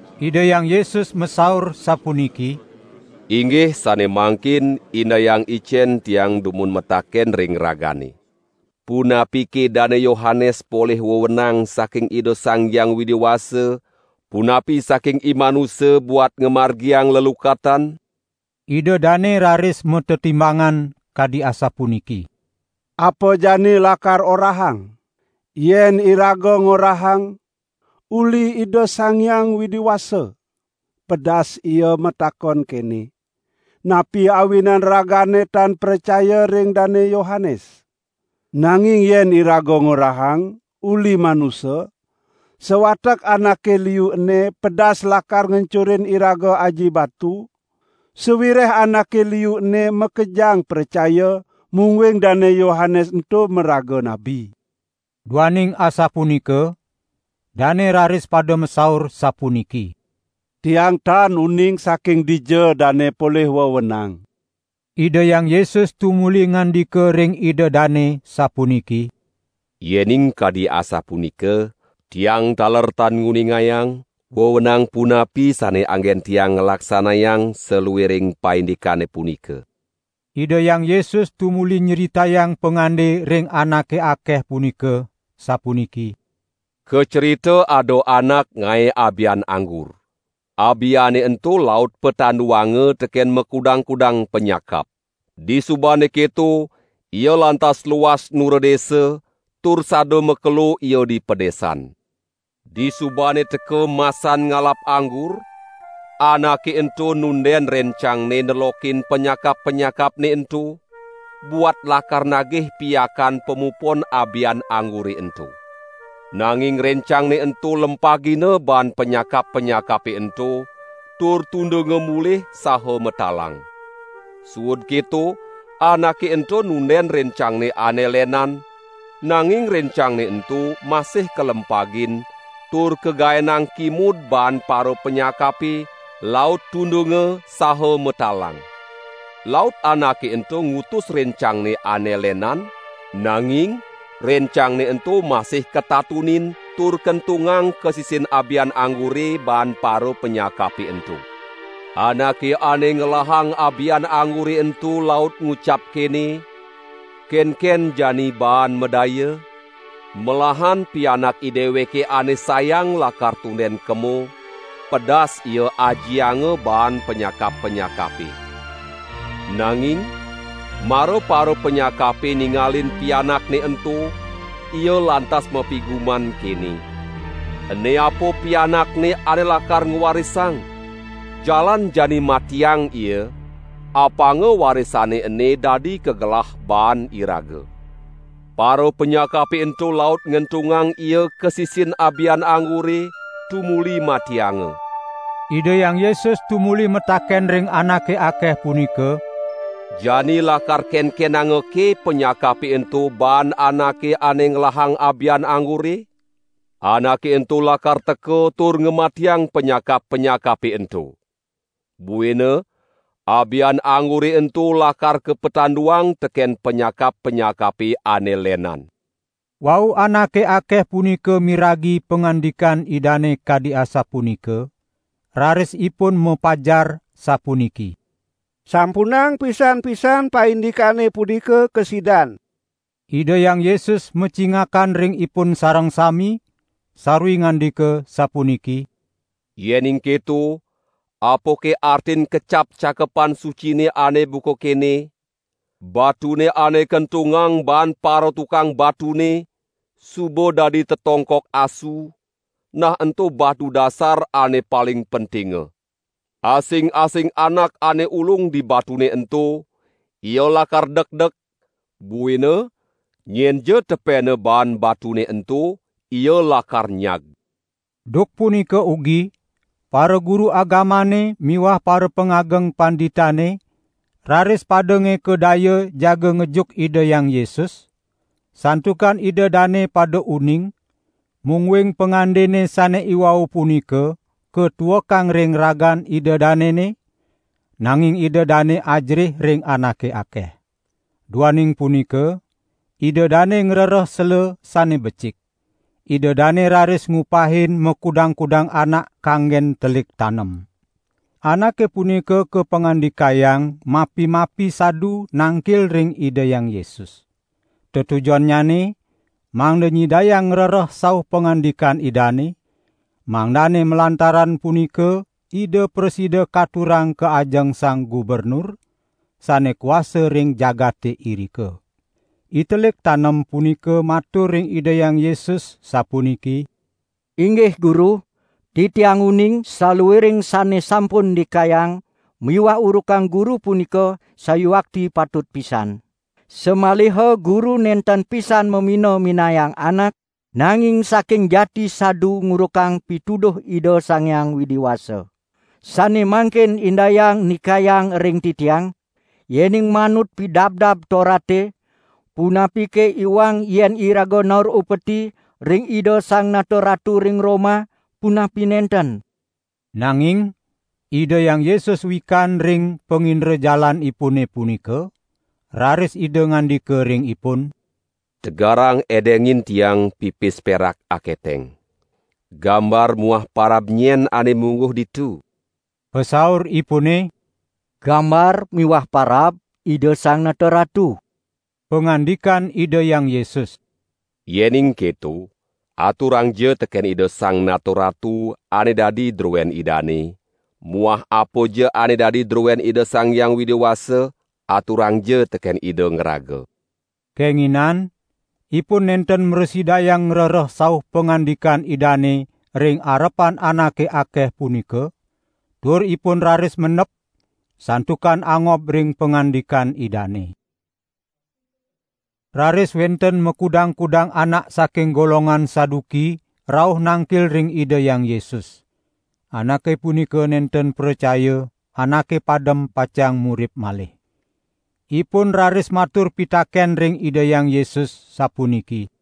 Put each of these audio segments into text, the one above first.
Ida Hyang Yesus masaur sapuniki: "Inggih sane mangkin indayang icen Tiang dumun mataken ring ragane. Punapike Dane Yohanes polih wewenang saking Ida Sang Hyang Widi Wasa, punapi saking imanusa buat ngamargiang lelukatan." Ida dane raris matetimbangan kadi asapuniki: "Apa jani lakar orahang? Yen iraga ngorahang: 'Uli Ida Sang Hyang Widi Wasa,' pedas Ia matakon kene: 'Napi awinan ragane tan pracaya ring Dane Yohanes?' Nanging yen iraga ngorahang: 'Uli manusa,' sawatek anake liu ene pedas lakar ngencurin iraga aji batu, sawireh anake liu ene makejang pracaya, mungguing Dane Yohanes ento maraga nabi." Duaning asapunika, dane raris pada masaur sapuniki: "Tiang tan uning saking dija dane polih wewenang." Ida Hyang Yesus tumuli ngandika ring ida dane, sapuniki: "Yening kadi asapunika, Tiang taler tan nguningayang, wewenang punapi sane anggen Tiang nglaksanayang saluiring paindikane punika." Ida Hyang Yesus tumuli nyritayang pangande ring anake akeh punika, sapuniki: "Kacrita ada anak ngae abian anggur. Abiane ento laut patanduanga teken makudang-kudang panyakap. Disubane keto ia lantas luas nura desa tur sada makelo ia di padesan. Disubane teka masan ngalap anggur, anake ento nunden rencangne nelokin panyakap-panyakapne ento, buat lakar nagih piakan pamupon abian anggure ento. Nanging rencangne ento lempagina baan panyakap-panyakape ento, tur tundunga mulih saha matalang. Suud keto anake ento nunden rencangne ane lenan, nanging rencangne ento masih kalempagin, tur kagaenang kimud baan parapanyakape, laut tundunga saha matalang. Laut anake ento ngutus rencangne ane lenan, nanging rencangne ento masih katatunin tur kentungang ka sisin abian anggure baan parapanyakape ento. Anake ane ngelahang abian anggure ento laut ngucap kene: 'Kenken jani baan madaya? Melahan pianak ideweke ane sayang lakar tunden kema; pedas ia ajianga baan panyakap-panyakape.' Nanging mara parapanyakape ningalin pianakne ento, ia lantas mapiguman kene: 'Ene apa pianakne ane lakar ngwarisang, jalan jani matiang ia, apanga warisane ene dadi kagelah baan iraga.' Parapanyakape ento laut ngentungang ia ka sisin abian anggure, tumuli matianga." Ida Hyang Yesus tumuli mataken ring anake akeh punika: "Jani lakar kenkenangake panyakape ento baan anake ane ngelahang abian anggure? Anake ento lakar teka tur ngamatiang panyakap-panyakape ento. Buina abian anggure ento lakar kapatanduang teken panyakap-panyakape ane lenan." Wau anake akeh punika miragi pangandikan Idane kadi asapunika, raris ipun mapajar sapuniki: "Sampunang pisan-pisan paindikane punika kasidan." Ida Hyang Yesus macingakan ring ipun sareng sami, sarwi ngandika sapuniki: "Yening keto, apake artin kecap Cakepan Sucine ane buka kene: Batune ane kentungang baan paratukang batune, suba dadi tetongkok asu, nah ento batu dasar ane paling pentinga.' Asing-asing anak ane ulung di batune ento, ia lakar dekdek, buina nyenja tepena baan batune ento ia lakar nyag." Duk punika ugi paraguru agamane miwah parapangageng panditane raris pada ngeka daya jaga ngejuk Ida Hyang Yesus, santukan ida dane pada uning, mungguing pangandene sane iwau punika katuekang ring ragan ida danene, nanging ida dane ajerih ring anake akeh. Duaning punika ida dane ngrereh sela sane becik. Ida dane raris ngupahin makudang-kudang anak kanggen telik tanem. Anake punika kapangandikayang mapi-mapi sadu nangkil ring Ida Hyang Yesus. Tetujonnyane mangda nyidayang ngrereh sauh pangandikan Idane, mangdane malantaran punika Ida prasida katurang ka ajeng sang gubernur, sane kuasa ring jagate irika. Itelik tanem punika matur ring Ida Hyang Yesus sapuniki: "Inggih Guru, titiang uning saluiring sane sampun ndikayang miwah urukang Guru punika sayuakti patut pisan. Samaliha Guru nenten pisan mamina-minayang anak, nanging saking jati sadu ngurukang pituduh Ida Sang Hyang Widi Wasa. Sane mangkin indayang ndikayang ring titiang, yening manut Pidabdab Torate, punapike iwang yen iraga naur upeti ring Ida Sang Nata Ratu ring Roma, punapi nenten?" Nanging Ida Hyang Yesus wikan ring pangindrajalanipune punika, raris Ida ngandika ring ipun: "Tegarang edengin Tiang pipis perak aketeng. Gambar muah parab nyen ane mungguh ditu?" Pasauripune: "Gambar miwah parab Ida Sang Nata Ratu!" Pangandikan Ida Hyang Yesus: "Yening keto, aturangja teken Ida Sang Nata Ratu ane dadi druen idane muah apaja ane dadi druen Ida Sang Hyang Widi Wasa, aturangja teken Ida ngraga." Kenginan ipun nenten mrasidayang ngrereh sauh pangandikan Idane ring arepan anake akeh punika, tur ipun raris mendep, santukan angob ring pangandikan Idane. Raris wenten makudang-kudang anak saking golongan Saduki rauh nangkil ring Ida Hyang Yesus. (Anake punika nenten pracaya, anake padem pacang murip malih.) Ipun raris matur pitaken ring Ida Hyang Yesus, sapuniki: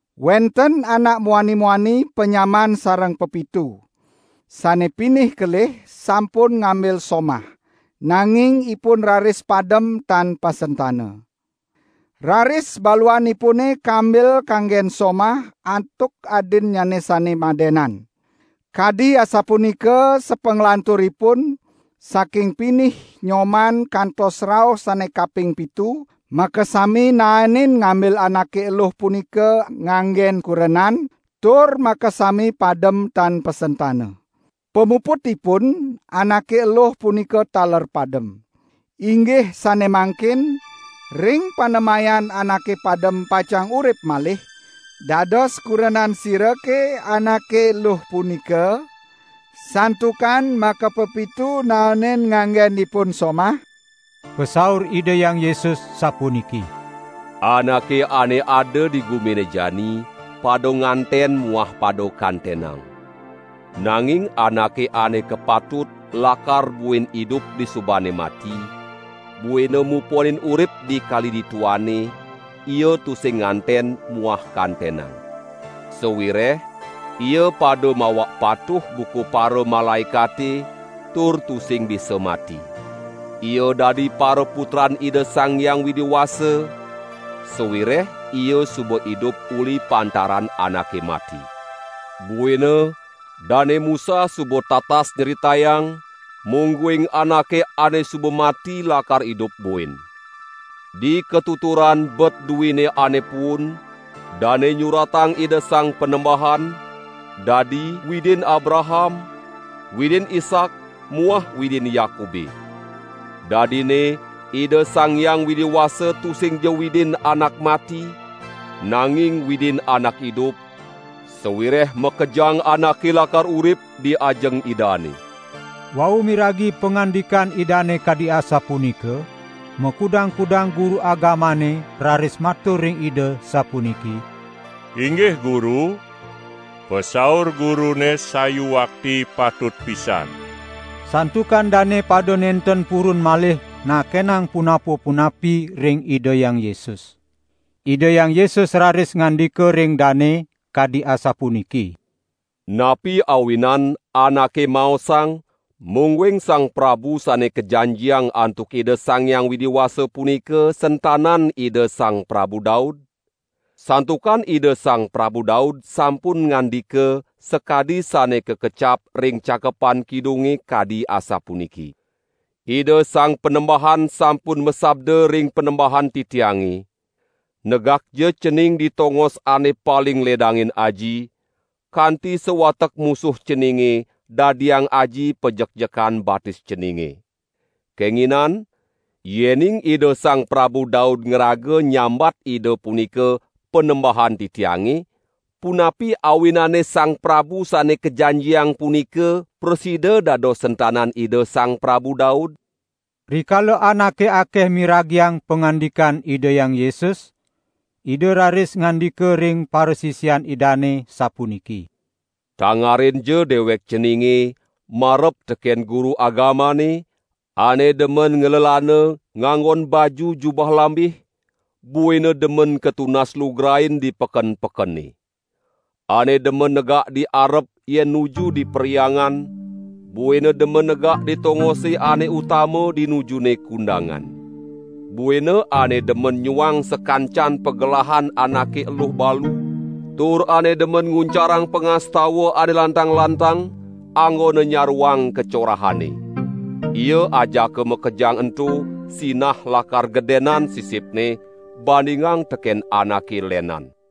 Wenten anak muani-muani panyamaan sareng pepitu. Sane pinih kelih sampun ngambil somah, nanging ipun raris padem tan pasentana. Raris baluanipune kambil kanggen somah antuk adinnyane sane madenan. Kadi asapunika sapanglanturipun, saking pinih nyoman kantos rauh sane kaping pitu, makasami naenin ngambil anake eluh punika anggen kurenan, tur makasami padem tan pasentana. Pamuputipun, anake eluh punika taler padem. Inggih sane mangkin, ring panemayan anake padem pacang urip malih, dados kurenan sirake anake eluh punika, santukan makapepitu naenin nganggen ipun somah?" Pasaur Ida Hyang Yesus sapuniki: "Anake ane ada di gumine jani pada nganten muah pada kantenang. Nanging anake ane kapatut lakar buin idup disubane mati, buina muponin urip di kali dituane, ia tusing nganten muah kantenang. Sawireh ia pada mawak patuh buka paramalaekate tur tusing bisa mati. Ia dadi paraputran Ida Sang Hyang Widi Wasa, sawireh ia suba idup uli pantaran anake mati. Buina Dane Musa suba tatas nyritayang, mungguing anake ane suba mati lakar idup buin. Dikatuturan bet duine ane puun, dane nyuratang Ida Sang Panembahan, dadi 'Widin Abraham, Widin Ishak muah Widin Yakube'. Dadinne Ida Sang Hyang Widi Wasa tusingja Widin anak mati, nanging Widin anak idup, sawireh makejang anake lakar urip di ajeng Idane." Wau miragi pangandikan Idane kadi asapunika, makudang-kudang guru agamane raris matur ring Ida sapuniki: "Inggih Guru, pasaur Gurune sayuakti patut pisan." Santukan dane pada nenten purun malih nakenang punapa-punapi ring Ida Hyang Yesus. Ida Hyang Yesus raris ngandika ring dane, kadi asapunika: "Napi awinan anake maosang mungguing Sang Prabu Sane Kajanjiang antuk Ida Sang Hyang Widi Wasa punika sentanan Ida Sang Prabu Daud? Santukan Ida Sang Prabu Daud sampun ngandika, sakadi sane kakecap ring Cakepan Kidunge, kadi asapuniki: Ida Sang Panembahan sampun masabda ring Panembahan titiange: Negakja Cening di tongos ane paling ledangin Aji, kanti sawatek musuh Ceninge dadiang Aji pajekjekan batis Ceninge.' Kenginan, yening Ida Sang Prabu Daud ngraga nyambat Ida punika, 'Panembahan titiange', punapi awinane Sang Prabu Sane Kajanjiang punika prasida dados sentanan Ida Sang Prabu Daud?" Rikala anake akeh miragiang pangandikan Ida Hyang Yesus, Ida raris ngandika ring parasisian Idane, sapuniki: "Tangarinja dewek ceninge marep teken guru agamane, ane demen nglelana nganggon baju jubah lambih, buina demen katunas lugrain di peken-pekene. Ane demen negak di arep yen nuju di perhyangan buina demen negak di tongose ane utama dinujune kundangan. Buina ane demen nyuang sakancan pagelahan anake eluh balu, tur ane demen nguncarang pangastawan ane lantang-lantang, anggona nyaruang kacorahane. Ia ajaka makejang ento sinah lakar gedenan sisipne bandingang teken anake lenan!"